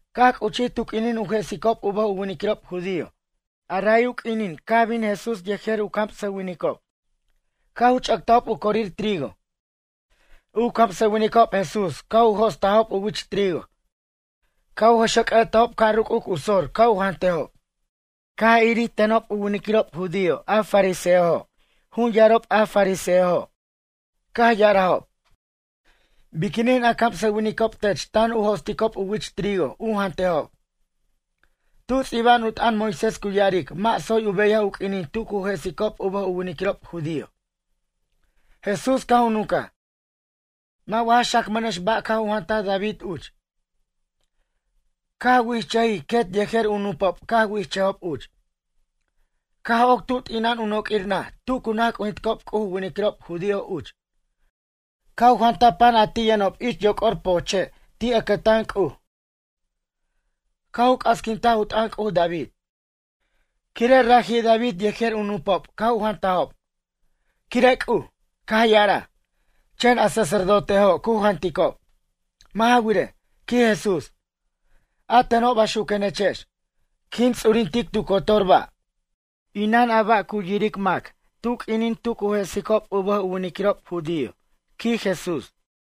Caj c'uchij tu q'uinin u jesicob u bʌj u winiquirob judío, ray u q'uinin caj bin Jesús yejer u camsʌwinicob caj u ch'ʌctajob u corir trigo. U camsʌwinicob Jesús caj u jo'stajob u wich trigo caj u jʌxʌc'ʌ'tajob ca' ruc'uc u sor ca' u jantejob. Caj irir tenob u winiquirob judío a fariseojo', jun yarob a fariseojo'. Caj ya'arajob: ―Biquinin a camsʌwinicob tech tan u jo'sticob u wich trigo u jantejob. Tu ts'iba'an u t'ʌn Moisés cu ya'aric mʌ' tsoy u beyaj u q'uinin tu cu jesicob u bʌj u winiquirob judío. Jesús caj u nuncaj: ―Mʌ' wa ja xacmʌnex ba' caj u jantaj David uch, caj wichʌj quet yejer u nupob caj wichʌjob uch. Caj oc tu t'ina'an u noq'uir naj tu cu naj c'ujinticob C'uj u winiquirob judío uch. Caj u jantaj pan a ti' yʌnob ich yoc'or pojche' ti' ʌcʌtan C'uj. Caj u c'asquintaj u t'ʌn C'uj David, quire' raji' David yejer u nupob caj u jantajob. Quire' C'uj, caj ya'araj, chen a sacerdotejo' cu janticob. Mʌ' ja wirej ―quij Jesús―, a teno' baxuquenechex, quin ts'urintic tu cotor ba', inan a ba' cu yiric mac tu q'uinin tu cu jesicob u bʌj u winiquirob judío ―quij Jesús.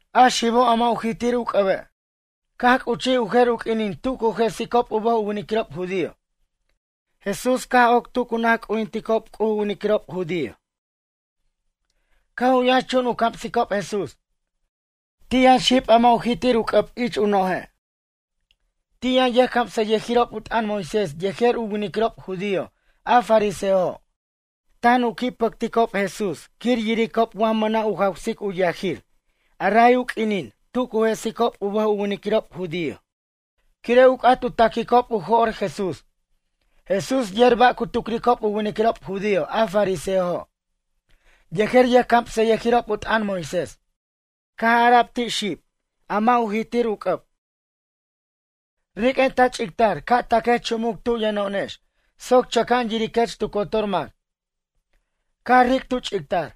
Caj c'uchij u jer u q'uinin tu q'uinin tu cu jesicob u bʌj u winiquirob judío. Jesús caj oc tu cu naj c'ujinticob C'uj u winiquirob judío. Caj u yʌnxchun u camsicob Jesús. Ti' yʌn xib a mʌ' u jitir u c'ʌb ich u noje'. Ti' yʌn yʌjcamsʌyʌjirob u t'ʌn Moisés yejer u winiquirob judío a fariseojo'. Tan u qui' pʌcticob Jesús quir yiricob wa mʌna' u jawsic u yajir ray u q'uinin tu cu jesicob u bʌj u winiquirob judío, quire' u c'at u taquicob u jo'r Jesús. Jesús yer ba' cu tucricob u winiquirob judío a fariseojo' yejer yʌjcamsʌyʌjirob u t'ʌn Moisés. Caj ara'b ti' xib, a mʌ' u jitir u c'ʌb: ―Riq'uen ta ch'ictar ca' taquech chumuc tu yʌno'onex soc chʌca'an yiriquech tu cotor mac. Caj ric' tu ch'ictar.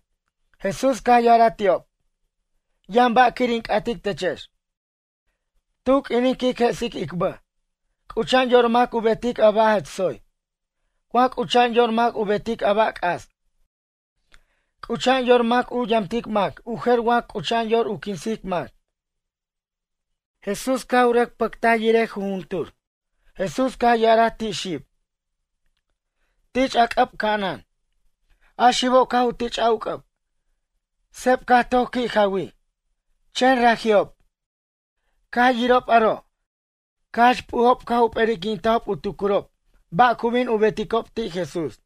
Jesús caj ya'araj ti'ob: ―Yʌn ba' quir in c'atic techex. Tu q'uinin quic jesic ic bʌj. C'ucha'an yor mac u betic a ba' jach tsoy, wa c'ucha'an yor mac u betic a ba' c'as? C'ucha'an yor mac u yamtic mac u jer wa c'ucha'an yor u quinsic mac? Jesús caj u rʌc pʌctaj yirej jujuntur, Jesús caj ya'araj ti' xib: ―Tich' a c'ʌb ca'anan. A xibo' caj u tich'aj u c'ʌb, seb caj toc qui' jawij. Chen raji'ob, caj yirob aro' caj jach p'ujob caj u p'erinquintajob u tucurob ba' cu bin u beticob ti' Jesús.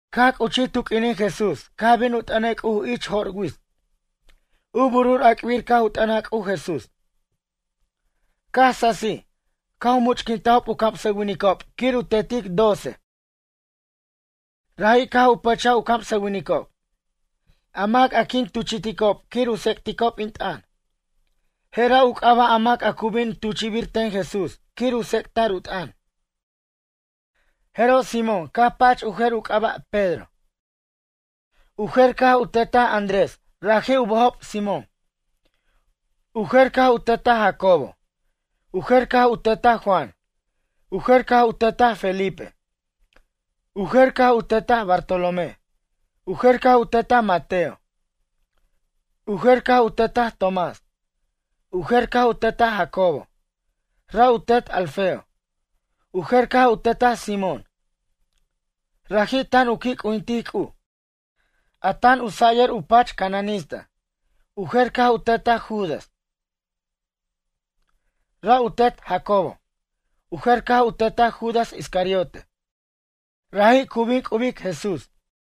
Caj c'uchij tu q'uinin Jesús caj bin u t'ʌnej C'uj ich jo'r wits. U burur ac'bir caj u t'ʌnaj C'uj Jesús. Caj sasij caj u much'quintajob u camsʌwinicob quir u tetic doce, raji' caj u pʌcha u camsʌwinicob: “A mac a quin tuchi'ticob quir u tsec'ticob in t'ʌn.” Jera' u c'aba' a mac a cu bin tuchi'bir ten Jesús quir u tsec'ta'r u t'ʌn. Jeroj Simón caj pach u jer u c'aba' Pedro. U jer caj u tetaj Andrés, raji' u bʌjob Simón. U jer caj u tetaj Jacobo. U jer caj u tetaj Juan. U jer caj u tetaj Felipe. U jer caj u tetaj Bartolomé. U jer caj u tetaj Mateo. U jer caj u tetaj Tomás. U jer caj u tetaj Jacobo, ra' u tet Alfeo. U jer caj u tetaj Simón, raji' tan u qui' c'ujintic C'uj, a tan u sayʌr u pach cananista. U jer caj u tetaj Judas, ra' u tet Jacobo. U jer caj u tetaj Judas Iscariote, raji' cu bin c'ubic Jesús.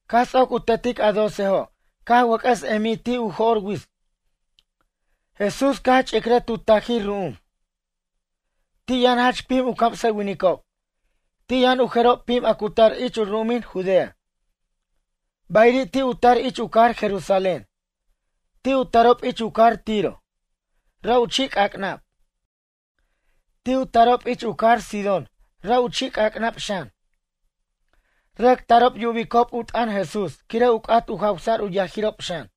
Caj ts'oc u tetic a docejo' caj wʌc'ʌs emij ti' u jo'r wits. Jesús caj ch'icrʌj tu tajir ru'um. Ti' yʌn jach pim u camsʌwinicob. Ti' yʌn u jerob pim a cu tar ich u ru'umin Judea, bayiri' ti' u tar ich u cajar Jerusalén. Ti' u tarob ich u cajar Tiro, ra' u chi' c'ac'nab. Ti' u tarob ich u cajar Sidón ra' u chi' c'ac'nab xan. Rʌc tarob yubicob u t'ʌn Jesús quire' u c'at u jawsa'r u yajirob xan.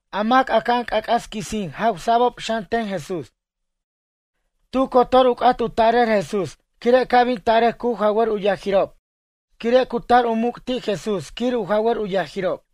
A mac aca'an c'ac'as quisin jawsa'bob xan ten Jesús. Tu cotor u c'at u tarʌr Jesús quire' ca' bin tarʌc cu jawar u yajirob quire' cu tar u muc' ti' Jesús quir u jawar u yajirob.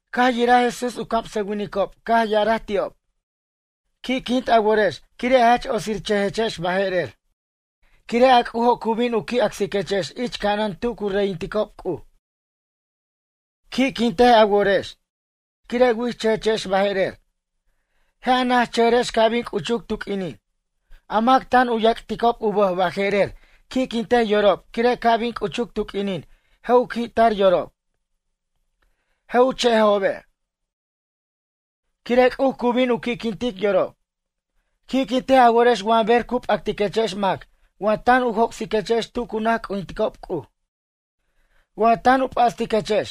Caj yiraj Jesús u camsʌwinicob caj ya'araj ti'ob: ―Qui'quint a worex quire' jach otsirchʌjechex baje'rer quire' a C'ujo' cu bin u qui' acsiquechex ich ca'anan tu cu reyinticob Cuj. ’Qui'quintej a worex quire' wichʌjechex baje'rer, je' a najchʌjʌrex ca' bin c'uchuc tu q'uinin. A mac tan u yac'ticob u bʌj baje'rer qui'quintej yorob quire' ca' bin c'uchuc tu q'uinin je' u qui'tar yorob, je' u che'ejobe', quire' C'uj cu bin u qui'quintic yorob. ’Qui'quintej a worex wa ber cu p'actiquechex mac wa tan u joc'siquechex tu cu naj c'ujinticob C'uj. Wa tan u p'astiquechex,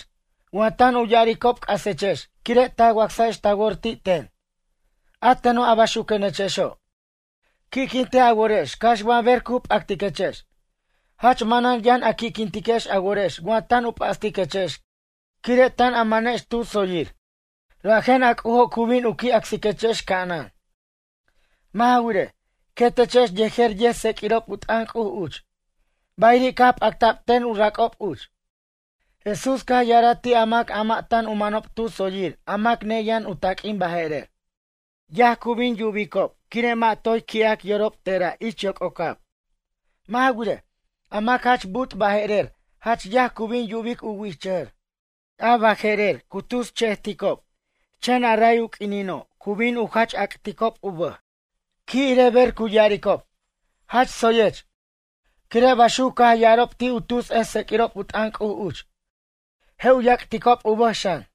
wa tan u ya'aricob c'asechex quire' ta wacsajex ta wor ti' ten, a teno' a baxuquenechexo'. Qui'quintej a worex cax wa ber cu p'actiquechex, jach manan yʌn a qui'quintiquex a worex wa tan u p'astiquechex quire' tan a manex tu tsoyir. Rajen a C'ujo' cu bin u qui' acsiquechex ca'anan. Mʌ' ja wirej, quetechex yejer yʌjtseq'uirob u t'ʌn C'uj uch. Bayiri' caj p'acta'b ten u rac'ob uch. Jesús caj ya'araj ti' a mac a mʌ' tan u manob tu tsoyir a mac neyʌn u taq'uin baje'rer: ―Yaj cu bin yubicob quire' toy qui'ij yorob tera' ich yoc'ocab. ’Mʌ' ja wirej, a mac jach bu'ut baje'rer jach yaj cu bin yubic u wichʌjʌr. A baje'rer cu tus che'eticob chen a ray u q'uinino' cu bin u jach ac'ticob u bʌj. ’Qui' irej ber cu ya'aricob: “Jach tsoyech”, quire' baxuc caj ya'arob ti' u tus ʌjtseq'uirob u t'ʌn C'uj uch. Je' u yac'ticob u bʌj xan.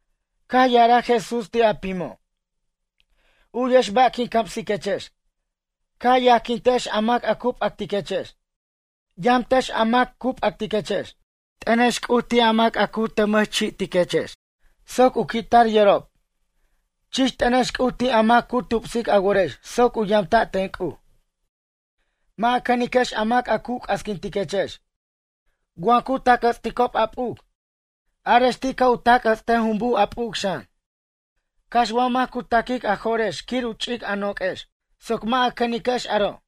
Caj ya'araj Jesús ti' a pimo': ―U'yex ba' quin camsiquechex. Ca' a yajquintex a mac cu p'actiquechex. Yamtex a mac cu p'actiquechex. T'ʌnex C'uj ti' a mac cu tʌmʌchi'tiquechex soc u qui'tar yorob. Chich t'ʌnex C'uj ti' a mac cu tupsic a worex soc u yamta' ten C'uj. Mʌ' a cʌniquex a mac a cu c'asquintiquechex. Wa cu tac' jʌts'ticob a p'uc, arex ti' ca' u tac' jʌts'tej jumbuj a p'uc xan. Cax wa mac cu ta'quic a jo'rex quir u ch'ic a noq'uex, soc mʌ' a cʌniquex aro',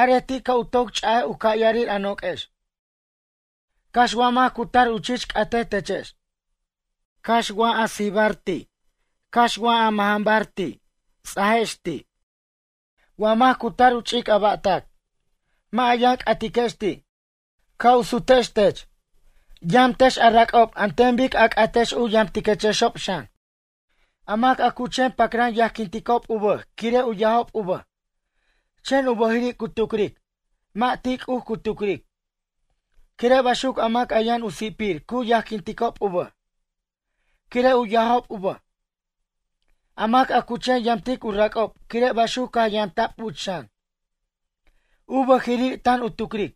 arej ti' ca' u toc ch'aj u ca'yarir a noq'uex. Cax wa mac cu tar u chich c'atej techex. Cax wa sijibar ti', cax wa mʌjʌnbar ti', ts'ajex ti'. Wa mac cu tar u ch'ic a ba'tac, mʌ' a yʌn c'atiquex ti', ca' u sutextech. Yamtex a rac'ob an ten bic a c'atex u yamtiquexob xan. ’A mac a cu chen pacran yajquinticob u bʌj quire' u yajob u bʌj, chen u bʌjiri' cu tucric, mʌ' ti' C'uj cu tucric. Quire' baxuc a mac yʌn u si'pir cu yajquinticob u bʌj, quire' u yajob u bʌj. A mac a cu chen yamtic u rac'ob quire' baxuc caj yamta'b uch xan. U bʌjiri' tan u tucric,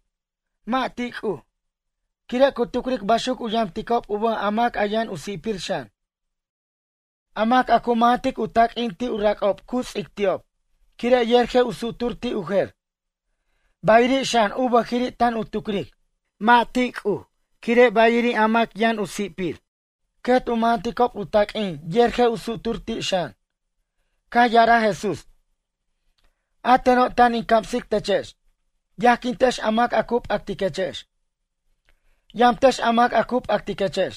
mʌ' ti' C'uj, quire' cu tucric baxuc u yamticob u bʌj a mac yʌn u si'pir xan. A mac a cu mʌjʌntic u taq'uin ti' u rac'ob cu ts'ic ti'ob quire' yer je' u sutur ti' u jer, bayiri' xan u bʌjiri' tan u tucric. Mʌ' ti' C'uj quire' bayiri' a mac yʌn u si'pir, quet u mʌjʌnticob u taq'uin yer je' u sutur ti' xan. Caj ya'araj Jesús: ―A teno' tan in camsic techex. Yajquintex a mac cu p'actiquechex. Yamtex a mac cu p'actiquechex.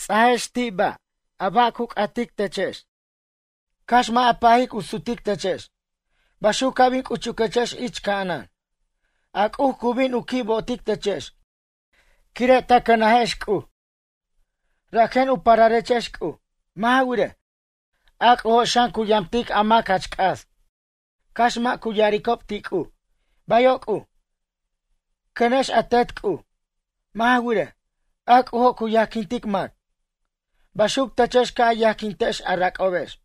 Ts'ajex ti' ba', a ba' u c'atic techex, cax mʌ' a pajic u sutic techex. Baxuc ca' bin c'uchuquechex ich ca'anan. A C'uj cu bin u qui' bo'otic techex quire' ta cʌnajex C'uj, rajen u pararechex C'uj. Mʌ' ja wirej, a C'ujo' xan cu yamtic a mac jach c'as cax mʌ' cu ya'aricob ti' C'uj: “Bayo' C'uj.” Cʌnex a Tet C'uj, mʌ' ja wirej, a C'ujo' cu yajquintic mac. Baxuc techex ca' a yajquintex a rac'obex.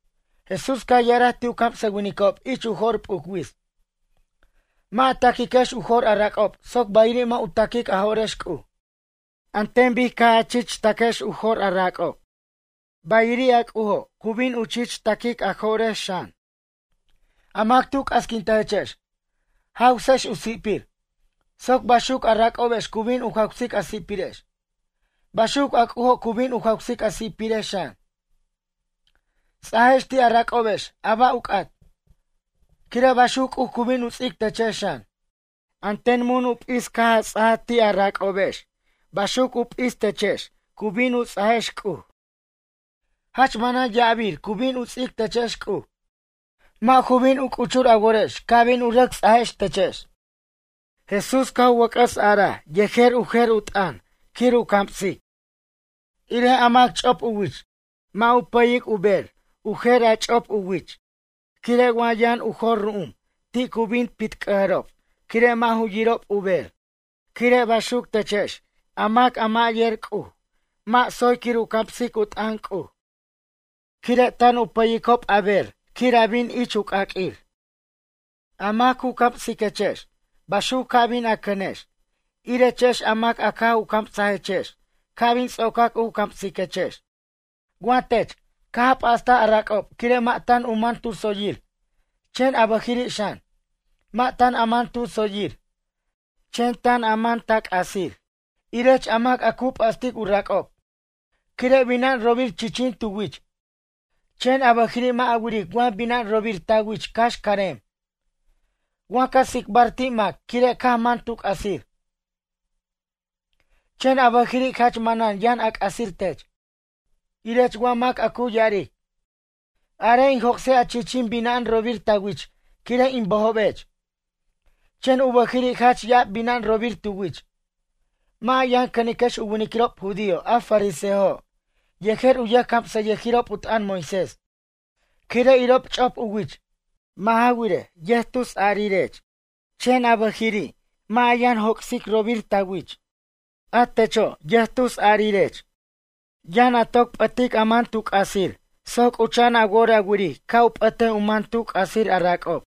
Jesús caj ya'araj ti' u camsʌwinicob ich u jo'r p'uc wits: ―Mʌ' a ta'quiquex u jo'r a rac'ob soc bayiri' mʌ' u ta'quic a jo'rex C'uj. An ten bic caj a chich ta'quex u jo'r a rac'ob. Bayiri' a C'ujo' u bin u chich ta'quic a jo'rex xan. A mac tu c'asquintajechex, jawsex u si'pir soc baxuc a rac'obex cu bin u jawsic a si'pirex. Baxuc a C'ujo' cu bin u jawsic a si'pirex xan. Ts'ajex ti' a rac'obex a ba' u c'at, quire' baxuc C'uj cu bin u ts'ic techex xan. An ten mun u p'is caj a ts'aj ti' a rac'obex baxuc u p'is techex cu bin u ts'ajex C'uj. Jach manan ya'abir cu bin u ts'ic techex C'uj, mʌ' ju bin u c'uchur a worex ca' bin u rʌc ts'ajtechex. Jesús caj u wʌc'ʌs araj yej u jer u t'ʌn quir u camsic: ―Irej a mac ch'op u wich, mʌ' u pʌyic u bej u jer ch'op u wich. Quire' wa yʌn u jor ru'um ti' cu bin u p'itc'ʌjob quire' mʌ' yirob u bej. Quire' baxuc techex a mac a mʌ' yer C'uj, mʌ' tsoy quir u camsic u t'ʌn C'uj. Quire' tan u pʌyicob a bej quir a bin ich u c'aq'uir. A mac cu camsiquechex baxuc ca bin a cʌnex, irechex a mac caj u camsajechex ca' bin ts'ocac u camsiquechex. ’Wa tech, caj a p'astaj a rac'ob quire' mʌ' tan u man tu tsoyir, chen a bʌjiri' xan, mʌ' tan a man tu tsoyir, chen ta man ta c'asir. Irech a mac a cu p'astic u rac'ob quire' bina'an robir chichin tu wich. Chen a bʌjiri' mʌ' a wiric wa bina'an robir ta wich cax carem. Wa ca tsicbar ti' mac quire' caj man tu c'asir, chen a bʌjiri' jach manan yʌn a c'asir tech. Irech wa mac a cu ya'aric: “Arej in joc'sej a chichin bina'an robir ta wich quire' in bʌjobech.” Chen u bʌjiri' jach ya'ab bina'an robir tu wich. Mʌ' a yʌn cʌniquex u winiquirob judío a fariseojo' yejer u yʌjcamsʌyʌjirob u t'ʌn Moisés quire' irob ch'op u wich. Mʌ' ja wirej, yʌjtusarirech. Chen a bʌjiri' mʌ' a yʌn joc'sic robir a wich. A techo' yʌjtusarirech. Yʌn a toc p'ʌtic a man tu c'asir soc c'ucha'an a wor a wiric ca' u p'ʌt u man tu c'asir a rac'ob.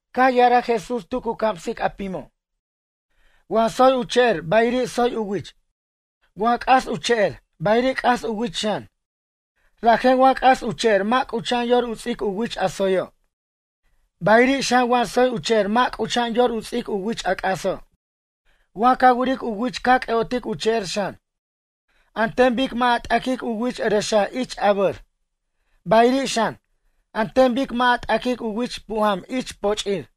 Caj ya'araj Jesús tu cu camsic a pimo': ―Wa tsoy u che'er bayiri' tsoy u wich. Wa c'as u che'er, bayiri' c'as u wich xan. Rajen wa c'as u che'er mʌ' c'ucha'an yor u ts'ic u wich a tsoyo'. Bayiri' xan wa tsoy u che'er mʌ' c'ucha'an, yor u ts'ic u wich a c'aso'. Wa ca wiric u wich ca c'ʌ'otic u che'er xan. An ten bic mʌ' a t'aquic u wich ʌrʌxa' ich abʌr, bayiri' xan, an ten bic mʌ' a t'aquic u wich pujam ich poch'ir.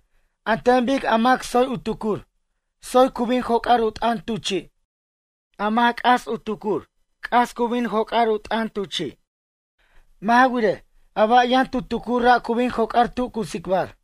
An ten bic a mac tsoy u tucur, tsoy cu bin joc'ar u t'ʌn tu chi'. A mac c'as u tucur c'as, cu bin joc'ar u t'ʌn tu chi'. Mʌ' ja wirej, a ba' yʌn tu tucur ra' cu bin joc'ar tu cu tsicbar.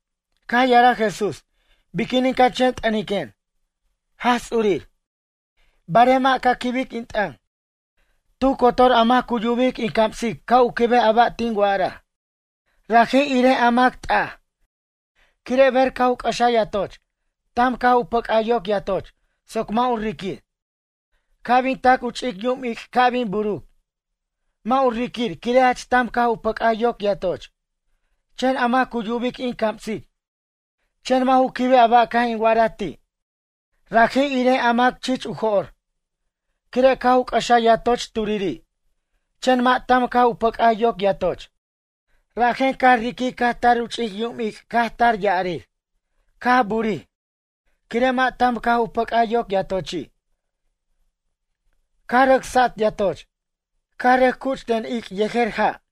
Caj ya'araj Jesús: ―Biquinin ca chen t'ʌniquen, “Jaj Ts'urir”, barej mʌ' ca quibic in t'ʌn? Tu cotor a mac cu yubic in camsic ca' u quibej a ba' tin wa'araj. Raji' irej a mac t'aj. Quire' ber caj u c'ʌxaj yatoch, tam caj u pʌc'aj yoc yatoch soc mʌ' u riquir. Ca' bin tac u ch'icyum ic' ca' bin buruc, mʌ' u riquir quire' jach tam caj u pʌc'aj yoc yatoch. Chen a mac cu yubic in camsic, chen mʌ' ju quibej a ba' caj in wa'araj ti', raji' irej a mac chich u jo'r. Quire' caj u c'ʌxaj yatoch turiri', chen mʌ' tam caj u pʌc'aj yoc yatoch. Rajen caj riquij caj tar u ch'icyum ic' caj tar ya'arir, caj bu'urij. Quire' mʌ' tam caj u pʌc'aj yoc yatochi'. Caj rʌc sat yatoch, caj rʌc cuch ten ic' yejer ja'.